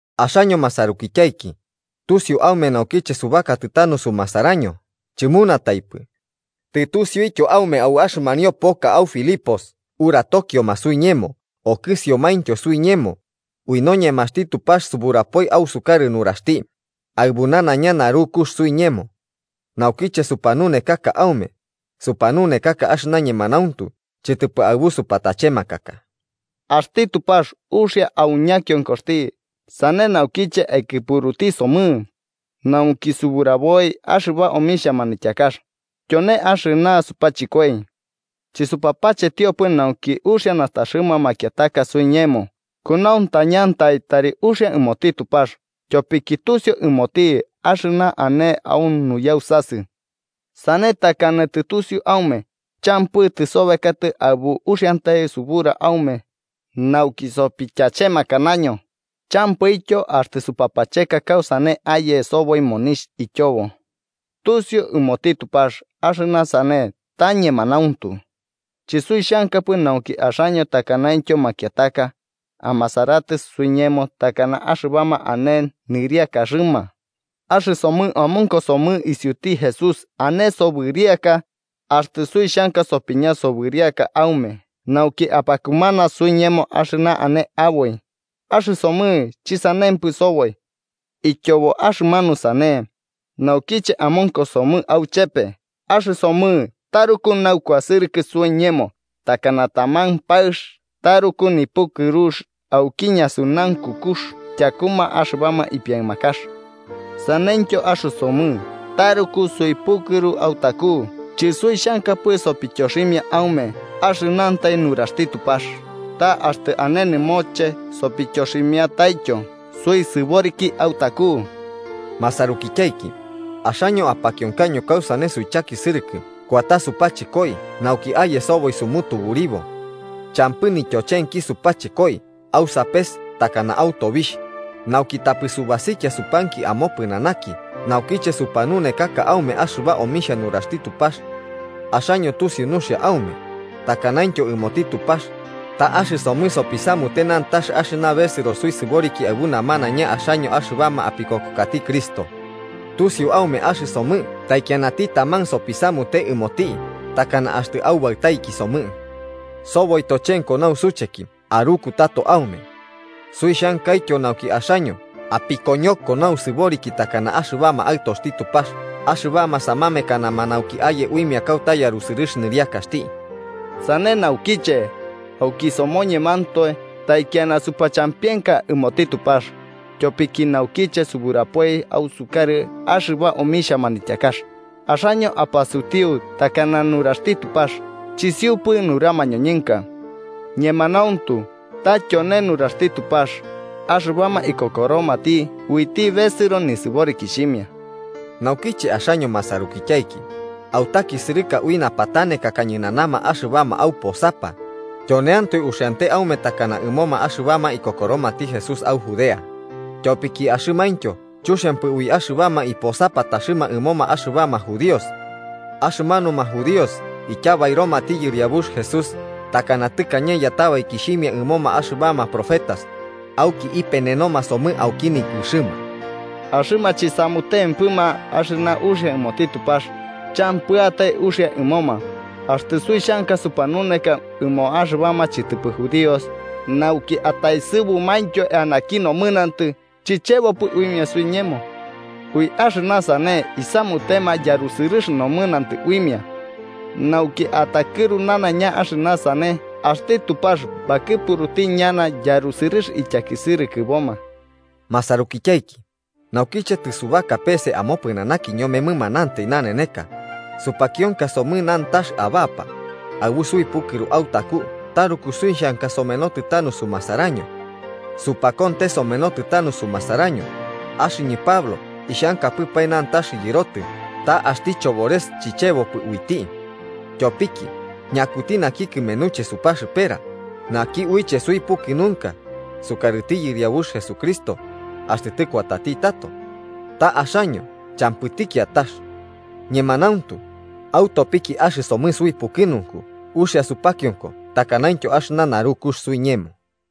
Axaño masarukityaiki, tusiu aume naukiche subakatɨ tanu sumasaraño chɨmunataipɨ. Tɨtusiuityo aume au axɨmanio poka au Filipos uratokioma suiñemo okɨsiomaintyo suiñemo, ui noñemaxti Tupax suburapoi ausukarɨ nuraxti, aɨbu nanaiña narukux suiñemo. Naukiche supanunekaka aume, supanunekaka axɨna ñemanauntu chɨtɨpɨ aɨbu supatachemakaka. Axti Tupax uxia au ñakionkoxti sane naukiche aikɨpuruti somɨ, nauki suburaboi axɨba omixhia manityakax, tyone axɨna supachɨkoi. Chɨsupapachetiopɨ nauki uxia nastaxɨma makiataka suiñemo, kunauntañantai tari uxia ɨmoti Tupax, tyopiki tusiu ɨmoti axɨna ane au nuyausasɨ. Sane takana tɨtusiu aume, champɨ tɨsobekatɨ aɨbu uxiantai subura aume, nauki sopityachemakanaño, champɨityo axtɨ supapacheka kausane aye soboi monixh ityobo. Tusiu ɨmoti Tupax axɨna sane ta ñemanauntu. Chɨsuixhankapɨ nauki axaño takanaintyo makiataka, amasaratɨ suiñemo takana axɨbama ane nɨriakaxɨma. Axɨsomɨ amonkosomɨ isiuti Jesús ane sobɨriaka, axtɨ suixhankapɨ sopiña sobɨriaka aume nauki apakumana suiñemo axɨna ane aboi, axɨsomɨ chɨsanempɨ soboi. Ityobo axɨmanu sane, naukiche amonkosomɨ auchepe axɨsomɨ taruku naukuasɨrɨkɨ suiñemo, takana taman paɨx taruku nipukɨrux auki ñasunaunkukux tyakuma axɨbama ipiaɨmakax. Saneityo axɨsomɨ taruku suipukɨru autaku chɨsuixhankapɨ sopityoximia aume axɨnantai nuraxti Tupax, ta axtɨ ane nɨmoche sopityoximiataityo suisɨboriki autaku. Masarukityaiki, axaño apakionkaño kausane suichakisɨrɨka kuata supachɨkoi nauki aye soboi sumutuburibo. Champɨ nityochenki supachɨkoi au sapes takana au tobixh, nauki tapɨ subasikia supanki amopɨnanaki naukiche supanunekaka aume axɨba omixhia nuraxti Tupax. Axaño tusiu nuxia aume, takanaintyo ɨmoti Tupax, ta axɨsomɨ sopisamute nantax axɨna besɨro suisɨboriki aɨbu namanaina axaño axɨbama apikokokati Cristo. Tusiu aume axɨsomɨ taikianati taman sopisamute ɨmoti takana axtɨ aubaɨtaiki somɨ. Soboi tochenko nausucheki aruku tato aume. Suixhankaityo nauki axaño apikoñoko nausɨboriki takana axɨbama aɨtoxti Tupax, axɨbama samamekanama nauki aye uimia kauta yarusɨrɨx nɨriakaxti. Sane naukiche, auki somoñemantoe, taikiana supachampienka ɨmoti Tupax, tyopiki naukiche suburapoi ausukarɨ axɨba omixhia manityakax, axaño apasutiu takana nuraxti Tupax, chisiupɨ nura mañoñɨnka. Ñemanauntu ta tyone nuraxti Tupax, axɨbama ikokoromati uiti besɨro nisɨborikixhimia. Naukiche axaño masarukityaiki, autakisɨrɨka ui napatanekaka ñɨnanama axɨbama auposapa, tyoneantoe uxiante aume takana ɨmoma axɨbama ikokoromati Jesús au Judea, tyopiki axɨmaintyo chuxiampɨ ui axɨbama iposapataxɨma ɨmoma axɨbama judíos. Axɨmanuma judíos ityabairomati Yɨriabux Jesús, takana tɨkañe yatabaikixhimia ɨmoma axɨbama profetas, auki ipenenoma somɨ auki nikɨxɨma. Axɨma chisamutempɨma axɨna uxia ɨmoti Tupax, champɨatai uxia ɨmoma, axtɨ suixhanka supanuneka ɨmo axɨbama chɨtɨpɨ judíos, nauki ataesɨbumaintyo eanaki nomɨnantɨ chichebopɨ uimia suiñemo. Ui axɨna sane isamutema yarusɨrɨx nomɨnantɨ uimia. Nauki atakɨru nanaiña axɨna sane axti Tupax bakɨpuruti ñana yarusɨrɨx ityakisɨrɨkɨboma. Masarukityaiki, naukiche tɨsubaka pese amopɨnanaki ñome mɨmanantai naneneka, supakionka somɨ nantax abapa, aɨbu suipukɨru autaku taruku suixhanka somenotɨ tanu sumasaraño. Supakonte somenotɨ tanu sumasaraño, axɨñɨ Pablo ixhankapɨpae nantax yɨrotɨ, ta axti Chobores chichebopɨ uiti. Tyopiki, ¿ñakuti naki kɨmenuche supaxɨpera, naki uiche suipukɨnunka, sukarɨti Yɨriabux Jesucristo, axtɨ tɨkuatati tato? Ta axaño, champɨti kiatax. Ñemanauntu, autopiki axɨsomɨ suipukɨnunku uxia supakionko takanaintyo axɨna narukux suiñemo.